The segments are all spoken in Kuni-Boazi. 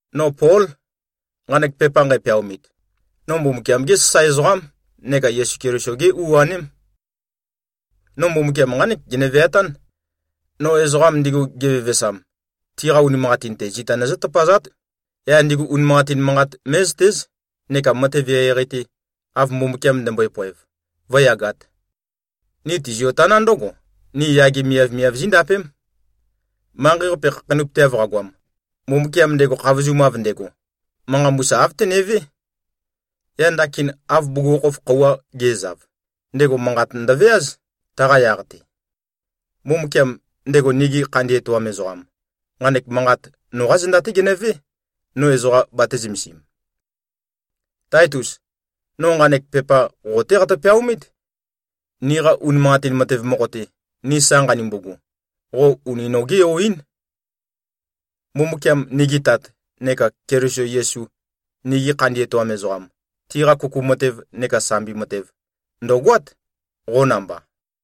No Pól, nqanek pepa nqæpeaomit. No Mbumbukiam-gé sasae ezoqám neka Yesu Keliso-gé u-aném. No Mbumbukiam nqánek gene-veatán: No ezoqam ndigu, gevevesam, tiqa unimanqatin-te, zita nøzǿ-tøpazát, yaq ndigu unimanqatin manqat mé꞉zøtéz, neka matev eqeieqei-te, av Mbumbukiam ndømbøe-poev, vǿyagāt. Ni tizio-taná ndǿgo: Ni yage miavmiav zíndapém. Manqei-qape khakheinøpøteav qagoam, Mbumbukiam ndego khavozumav ndego, manqa mbusa āv tenevé. Yaq ndakin, av bugukhokhof khøuwa ge꞉zav, ndego manqat ndøveáz, taqa yaq-te. Mbumbukiam, ndego nigi khandi etoam ezoqam, nqanek manqat noqá zenda-té genøvé, no ezoqa batē-zømesim. Táitus! No nqanek pepa qo-té qatø-peaomít. Niqa unimanqatin matev mokho-te, ni sa nqanumbugu, qo uni nogé-yo-ín. Mbumbukiam, nigi Tat, neka Keliso Yesu, nigi khandi etoam ezoqam, tiqa kuku matev neka sambi matev, ndø̀goát, qo namba.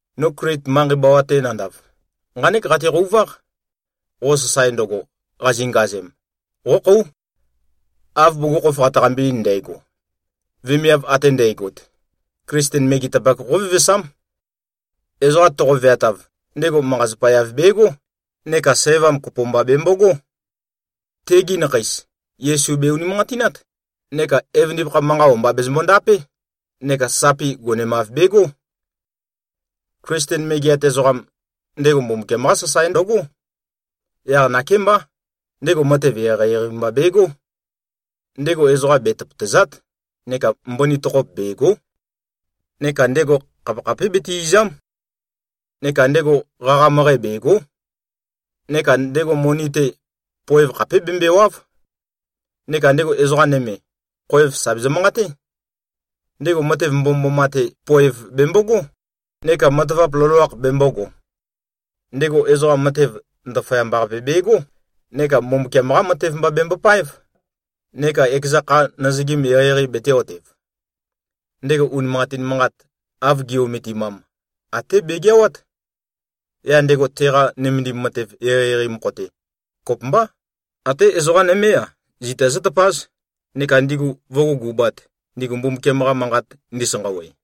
No Klit manqei bawa-te nandav, nqánek qateqøuváq: Qo sasae ndøgo, qazingazem, qókhóu. Av bugukhokhof qataqambe-ein ndægo, vemiav ate nandægot, Klisten megetapak qóvevesám. Ezoqa toqo-veatav, ndego manqa-zapa-yav begó neka sævam kopo mba bembogó. Tegi nakheis, Yesu be-unimanqatinát neka evøndipakha-qa manqa o-mba bezømbo-ndapé neka sapi gonemav begó. Klisten megeat ezoqam, ndego Mbumbukiam-qá sasae ndøgó. Yaq nakémbá, ndego matev eqeieqei mba begó. Ndego ezoqa be-tøpøtàza᷄t neka mbøni tokhop bègo᷄. Neka ndego khapekhapé bete-ìza᷄m. Neka ndego qaqa møqæ bègo᷄. Neka ndego moni-te, poev khapé bembøèwa᷄v. Neka ndego ezoqa nøme, khoev sà bezø-manqaté. Ndego matev mbomømboma-te poev bembogó, neka matavap loloakh bembōgo. Ndego, ezoqa matev ndaføyamba-qape begó neka Mbumbukiam-qá matev mba bembopáev, neka ekeza kha nøzøgim eqeieqei betē-otev. Ndego unimanqatin manqat, av gi꞉-ometimam, até begeawát. Yaq ndego, teqa nømendim matev eqeieqei mokho-te, kopømbá, até ezoqa nømé-a, zita zǿtøpáz, neka ndigu vǿgugubāt, ndigu Mbumbukiam-qa Manqat ndisanqawe.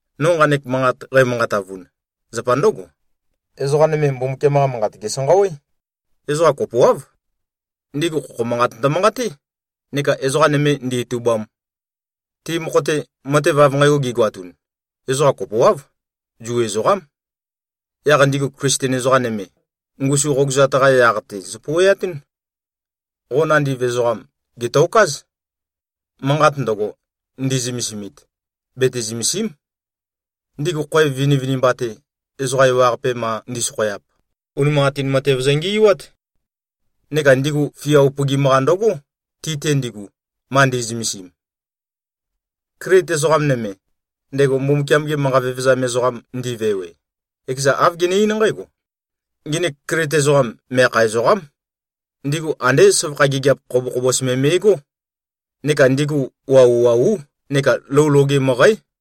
No nqanek manqat qæmanqatavun, zapa ndǿgo: Ezoqa nøme, Mbumbukiam-qa manqat, gèsanqawé. Ezoqa kopoáv. Ndigu khokho manqat ndømanqaté neka ezoqa nøme ndītūbām. Ti mokho-te, matev av nqægo gigoatun, ezoqa kopoáv, Zu ezoqám. Yaq ndigu Klisten ezoqa nøme, ngusu qogøzat-qa yaq-te zøpouweatún. Qo nandiv ezoqam, gètokáz. Manqat ndøgo ndi꞉zømesimit, bete-zømèsi᷄m. Ndigu khoev vinivinimba-te, ezoqa ewaqape ma ndi꞉sokhoyap, unimanqatin matev zøngi꞉wát. Neka ndigu fia upøgim-qa ndøgó, ti-te ndigu, ma ndi꞉zømesim. Klit ezoqam nøme, ndego Mbumbukiam-ge manqa vevezam ezoqam ndi꞉vewe, ekezan āv gene-eín nqǽgo, “Nginik Klit ezoqam, meakha ezoqám. Ndigu andé søvakha gigiap khobokhobos me me꞉gó. Neka ndigu wauwaú neka lou loge møqǽ.”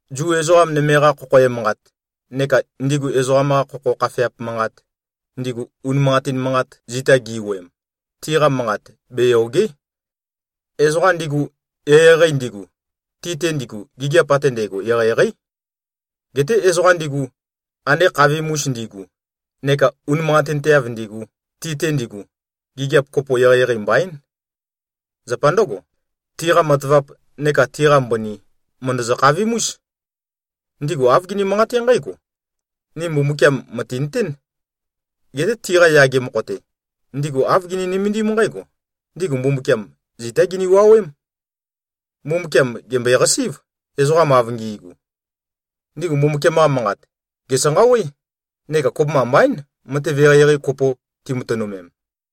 Zu ezoqa nøme-qa khokho emanqat, neka ndigu ezoqam-qa khokho khafeap manqat, ndigu unimanqatin manqat zita gi꞉wuøem, tiqa manqat beyòge᷄. Ezoqa ndigu, eqeieqei ndigu, ti-te ndigu, gigiap ate ndægo eqeieqeí. Geté ezoqa ndigu, ande khavim-us ndigu neka unimanqatinteav ndigu, ti-te ndigu, gigiap kopo eqeieqei mbaín. Zapa ndǿgo, tiqa matavap neka tiqa mbøni, mø̀ndøzø-khavim-ús. Ndigu āv gini-manqaté nqǽgo, “Ni Mbumbukiam mø̀tinøtén.” Geté tiqa yage mokho-te, ndigu āv gini-nømendím nqǽgo: Ndigu Mbumbukiam zitá gini-wuowém. Mbumbukiam gèmbøeqasí꞉v, ezoqam av ngi꞉gu. Ndigu Mbumbukiam-qa manqat, gèsanqawé, neka kopømba mbaín, matev eqeieqei kopo timatønømem.